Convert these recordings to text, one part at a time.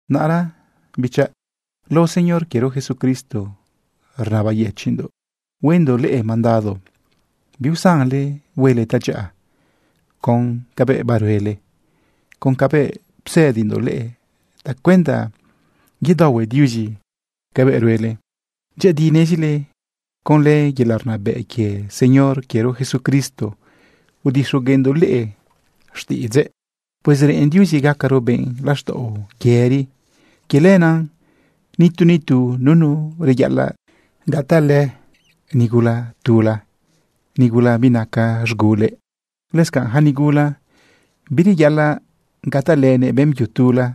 Naꞌra, bichaꞌ, lao Señor quiero Jesucristo, rnabayëchiꞌndoꞌ huendoꞌ leꞌe mandado biusanle huele tadyaꞌa con cabëꞌ baruele, con cabëꞌ psëdindoꞌ leꞌe tacuenda yedaohue Diuzi cabëꞌ ruele. Dyëꞌëdi nezile conlë yelaꞌ rnabëꞌ quie Señor quiero Jesucristo, udixogueꞌndoꞌ leꞌe xtiꞌidzëꞌ. Pues reꞌen Diuzi gacaro benꞌ laxtaꞌo yëri. Quie lenaꞌ nitu nitu nunu reyaꞌalaꞌ gatalënëꞌ nigula tula, nigula binaca z̃gulëꞌ. Lëscanꞌ yaca nigula bireyaꞌalaꞌ gatalënëꞌ beꞌmbyu tula.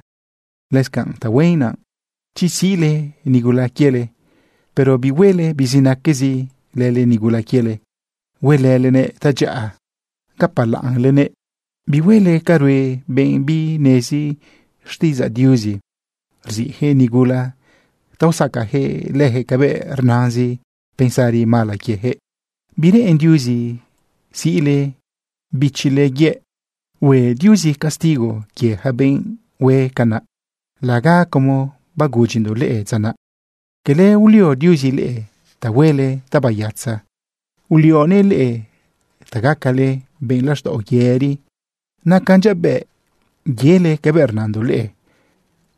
Lëscanꞌ tahuen naꞌ chi siꞌle nigula quiele, pero bihuele bizinaquezi lële nigula quiele. Huelëlenëꞌ tadyaꞌa gapalaꞌnlenëꞌ. Bihuele ca rue benꞌ binezi xtiꞌidzaꞌ Diuzi. Rziꞌjëꞌ nigula ta usacajëꞌ leyaquëꞌ cabëꞌ rnazin pensari mala quiejëꞌ. Bireꞌen Diuzi siꞌle bichile yëꞌ. Hue Diuzi castigo quie yaca benꞌ hue canaꞌ laga como bagudyindoꞌ leꞌe dza naꞌ. Cala ulio Diuzi leꞌe ta huele tabayatza. Ulioguëꞌ leꞌe ta gacale benꞌ laxtaꞌo yëri. Nacan dyabëꞌ yele cabëꞌ rnandoꞌ leꞌe.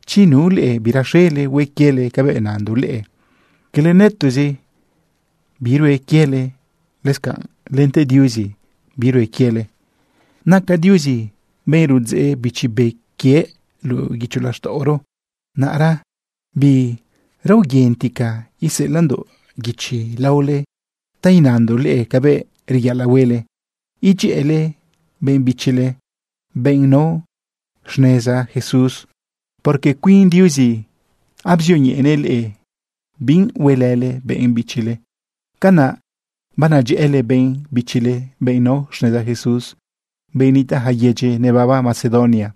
Chi nu leꞌe biraxele hue quiele cabëꞌ nandoꞌ leꞌe, cala nëtoꞌzi birue quiele, lëscanꞌ lente Diuzi birue quiele. Naca Diuzi benꞌ rudzeꞌ Bichi Be quiëꞌ luꞌu guicho laxtaꞌoro. Naꞌra biraoyentica iseꞌelaꞌndoꞌ guichi laole ta inandoꞌ leꞌe cabëꞌ reyaꞌalaꞌ huele idyëꞌële benꞌ bichile, benꞌ nao xneza Jesús, porque cuin Diuzi abzioñeꞌenëꞌ leꞌe bi huelële benꞌ bichile. Canaꞌ banadyëꞌële benꞌ bichile, benꞌ nao xneza Jesús, benꞌ nitaꞌ yaca yedyi nebaba Macedonia.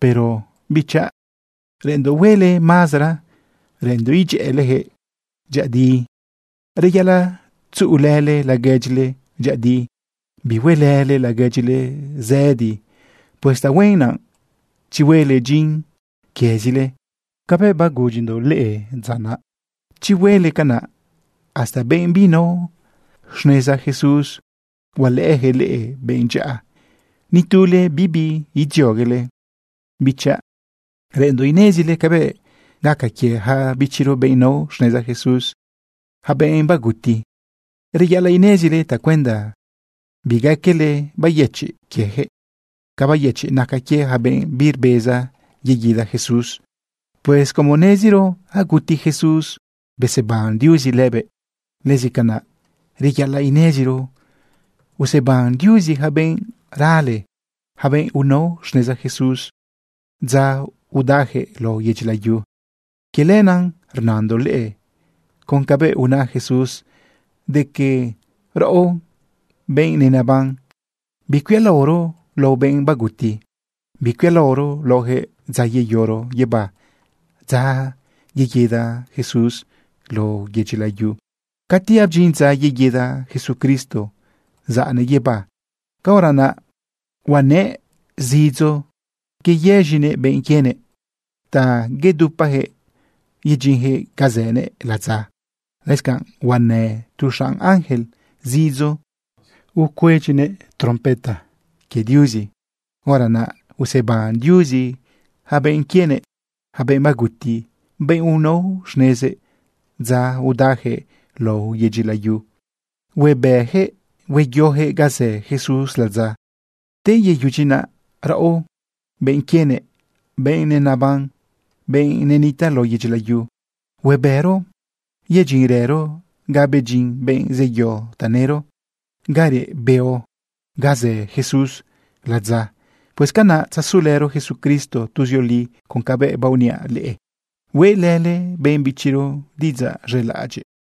Pero, bichaꞌ, reꞌenndoꞌ huele mazara, reꞌenndoꞌ idyëꞌëleyaquëꞌ dyëꞌëdi. Reyaꞌalaꞌ tzuꞌulële laguedyile dyëꞌëdi, bihuelële laguedyile zëdi. Pues tahuen naꞌ chi huele dyin quiezile como bagudyindoꞌ leꞌe dza naꞌ. Chi huele canaꞌ, hasta benꞌ binao xneza Jesús, hualëꞌëyaquëꞌ leꞌe benꞌ dyaꞌa, ni tule bibi idzioguele. Bichaꞌ, reꞌenndoꞌ inezile cabëꞌ gaca quie yaca bichiro, benꞌ nao xneza Jesús, yaca benꞌ baguti. Reyaꞌalaꞌ inezile tacuenda bigaquele bayëchiꞌ quieyaquëꞌ ca bayëchiꞌ naca quie yaca benꞌ birbeza yeguida Jesús. Pues como neziro aguti Jesús beseban Diuzi lëbëꞌ, lëscanaꞌ reyaꞌalaꞌ ineziro useban Diuzi yaca benꞌ rale, yaca benꞌ unao xneza Jesús dza udajëꞌ lao yedyi layu. Quie lenaꞌ rnandoꞌ leꞌe con cabëꞌ una Jesús de que raꞌo, benꞌ nenaban, bicuialaoro lao benꞌ baguti, bicuialaoro laojëꞌ dza yeyoro guibá, dza yeguida Jesús lao yedyi layu. Cati abdyin dza yeguida Jesucristo zaꞌnëꞌ guibá, caora naꞌ huanëꞌ zidzo yeyëz̃inëꞌ benꞌ quienëꞌ ta yedupayaquëꞌ yedyinyaquëꞌ ga zënëꞌ ladza. Lëscanꞌ huanë tu xanꞌ ángel zidzo rucuedyinëꞌ trompeta quie Diuzi. Hora naꞌ, useban Diuzi yaca benꞌ quienëꞌ, yaca benꞌ baguti, benꞌ unao xnezëꞌ dza udajëꞌ lao yedyi layu. Huebëyaquëꞌ hueyojëꞌ ga zë Jesús ladza. Te yeyudyi naꞌ, raꞌo, benꞌ quienëꞌ, benꞌ nenaban, benꞌ nenitaꞌ lao yedyi layu, huebëro yedyinrëro ga bedyin benꞌ zeyo tanëro, ga reꞌ beo, ga zë Jesús ladza. Pues canaꞌ tzazulëro Jesucristo tuzioli. Con cabëꞌ baoniaꞌ leꞌe, huelële benꞌ bichiro diꞌidzaꞌ z̃elaꞌadyiꞌ.